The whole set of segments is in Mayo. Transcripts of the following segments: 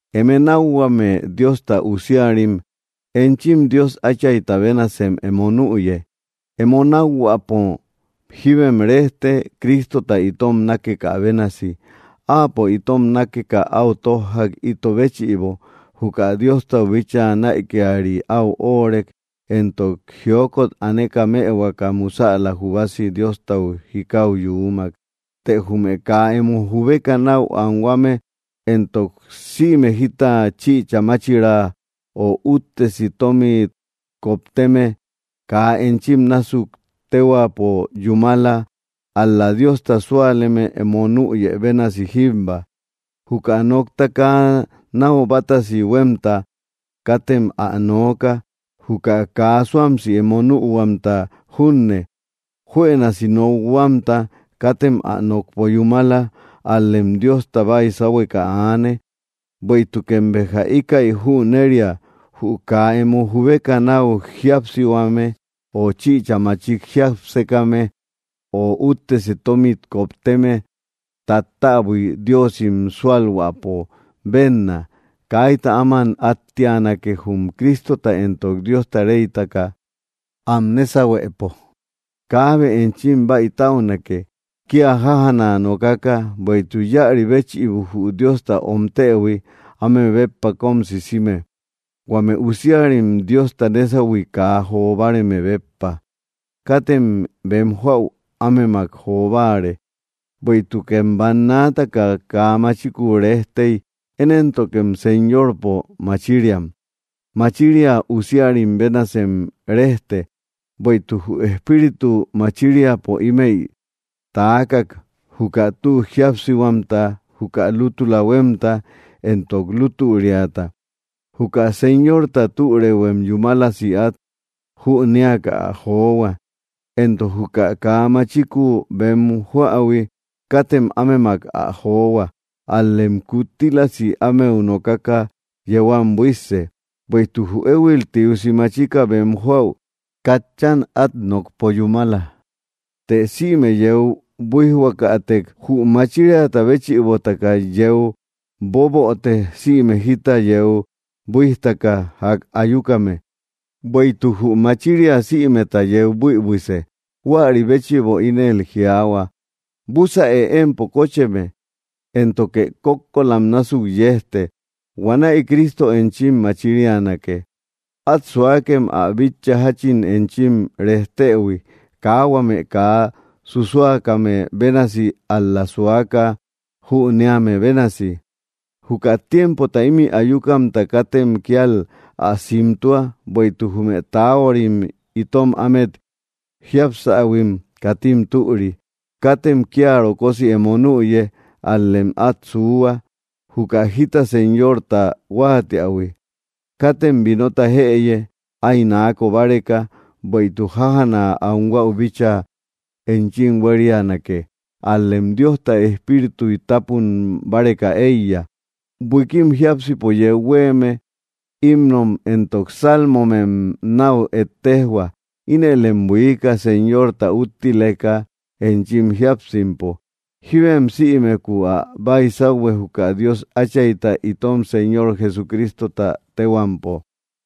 Eme nákhuame Diosta usiarim, enchim Dios Áchayta bénasem emo nüye. Emo nákhuäpo jíbem rejte, Cristota itom nákekä bénasi. Áapo itom nákeka áu tójjak, ito béchïbo. Juka Diostau bíchaa näikiari áu óorek, entok jiokot aneka mëhuaka musäla jubasi Diostau jikau yuumak. Të jume kaa emo jubeka náu anhuame entok sïme jita chïcha machira ö úttesi tomit kopteme, kaa enchim násuk téhuaapo yúmala, ál‑la Diosta súaleme emo nüyë bénasi jíbba. Juka nokta kaa náu bátasi huémta katem ä nooka, juka kaa suamsi emo nühuamta junne. Juënasi nokhuamta, katem ä nokpo yúmala; ál‑lem Diosta baysahueka aane. Bueïtukem béja íkäi jüneria, jü kaa emo jubeka náu jiápsame, ö chïcha machik jiápsekame, ö úttesi tómit kopteme tattäbui diosim súalhuäpo bénna. Kaita áman áttianake, jum Cristota entok Diosta reytaka am nésahuepo. Kaabe enchim baïtäunake, kia jájana nokaka, bueïtuk íäri béchïbo jü Diosta omtëhui áme béppa kóm sisime, huame usiarim Diosta nésahui kaa jo báareme béppa. Katem bem joäu ámemak jo báare. Bueïtukem bannaataka kaa machiku rejtey; én éntokem Señorpo machiriam; machiria usiarim bénasem rejte. Bueïtuk jü Espíritu machiriapo ímëi taakak: juka tü jíapsihuamta, juka lútula huémta, entok lutüriata. Juka Señorta türëuhuem yúmalasi át jünéaka ä johua. Entok juka kaa machiku bem joähui, katem ámemak ä johua; al‑lem kuttílasi ámeu nokaka yeu am buísse. Bueïtuk jü éhuil tiusi machika bem joäu katchan át nokpo yúmala. Të sïme yeu buíjhuakatek, jü machiriata béchïbotaka yeu boböte, sïme jita yeu buíjtaka ják ayukame. Bueïtuk jü machiria sïmeta yeu buïbuise. Huäri béchïbo ínel jiaahua: Búsäe empo kócheme, éntoke kókkolam násuk yejte. Huanäi Cristo enchi machirianake. Át suakem ä bitcha, jáchin enchim rejtëhui, kaa huame kaa susuakame bénasi, ál‑la suaka jüneame bénasi. Juka tiempota ímï ayukamta katem kíal ä simtua, bueïtuk jume taahuarim itom ámet jiapsähuim katim türi. Katem kia rokosi emo nüye; ál‑lem át suuhua, juka jita Señorta huáatiähui. Katem vinota jëye, áy naako báreka, bueïtuk jájana anhuäu bíchaa enchim huériunake; ál‑lem Diosta Espírituy tápun báreka éiya. Buikim jiápsipo yeu huéeme, himnom entok salmomem náu ejtejhua. Inëlem buiika, Señorta úttileka enchim jíapsimpo. Jíbem sïmeku ä baysauhue juka Dios Áchayta, itom Señor Jesucristota téhuampo.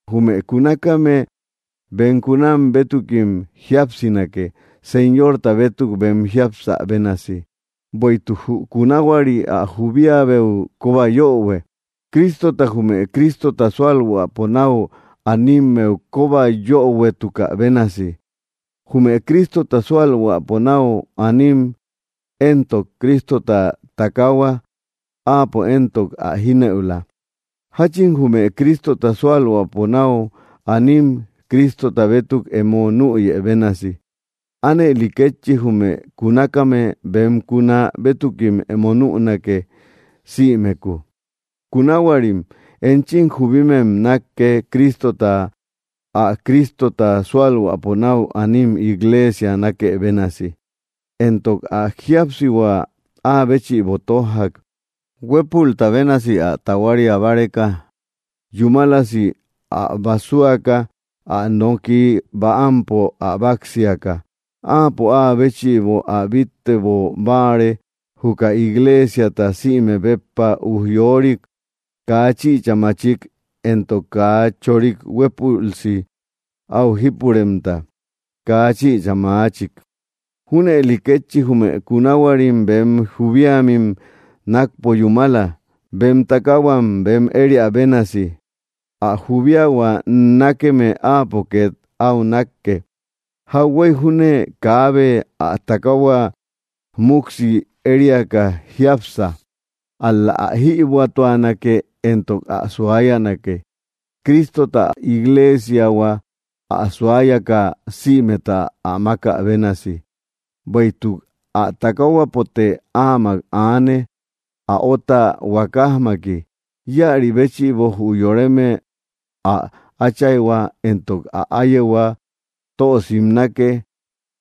Jume kunakame bem kunam bétukim jíapsinake, Señorta bétuk bem jiapsä bénasi. Bueïtuk jü kunahuari ä jubiabeu kóba yöhue, Cristota jume Cristota sualhuäpo nau animmeu kóba yöhuetukä bénasi. Jume Cristota sualhuäpo nau anim éntok Cristota takaahua; áapo éntok ä jínëula. Jáchin jume Cristota sualhuäpo nau anim Cristota bétuk emo nüyë bénasi, ánëli kétchi jume kunakame bem kuna bétukim emo nünake, sïmeku. Kunahuarim enchim jubimem nákke, Cristota ä Cristota sualhuäpo nau anim igleesia nákë bénasi. Entok ä jíapsihua áa béchïbo tójjak, huépulta bénasi ä tahuaria báreka, yúmalasi ä basuaka, ä nokiy bäampo ä báksiaka. Áapo áa béchïbo ä bíttebo báare, juka igleesiata, sïmek béppa ujyorik, kaa chïcha maachik entok kaa choorik, huépülsi áu jípuremta, kaa chïcha maachik. Júnëli kétchi jume kunahuarim bem jubiamim nákpo yúmala, bem takaahuam bem ériä bénasi. Ä jubiahua nákeme áapo két áu nákke. Jauhuey júne kaabe ä takaahua muksi eriaka jiápsa, ál‑la ä jïbuätuanake entok ä suayanake, Cristota ä igleesiahua ä suayaka sïmeta ä mákä bénasi. Bueïtuk ä takaahuapote áamak aane, ä óta huakajmaki. “Íäri béchïbo jü yoreme ä áchayhua entok ä áyehua tö simnake.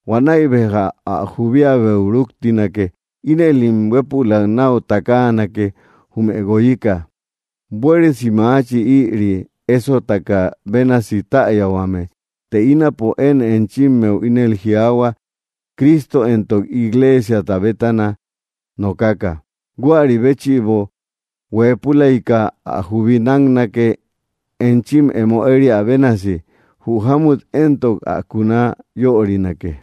Huanäi béja ä jubiabeu ruktinake. Inëlim huépülak náu takaanake, jume guoyika.” Buéresi maachi, ïri ésotaka bénasi täyahuame, të ínapo én enchimmeu ínel jiaahua, Cristo entok igleesiata bétana nokaka. Huäri béchïbo, hueepulayka ä jubi náknake, enchim emo eriä bénasi; jü jámut éntok ä kuna yörinake.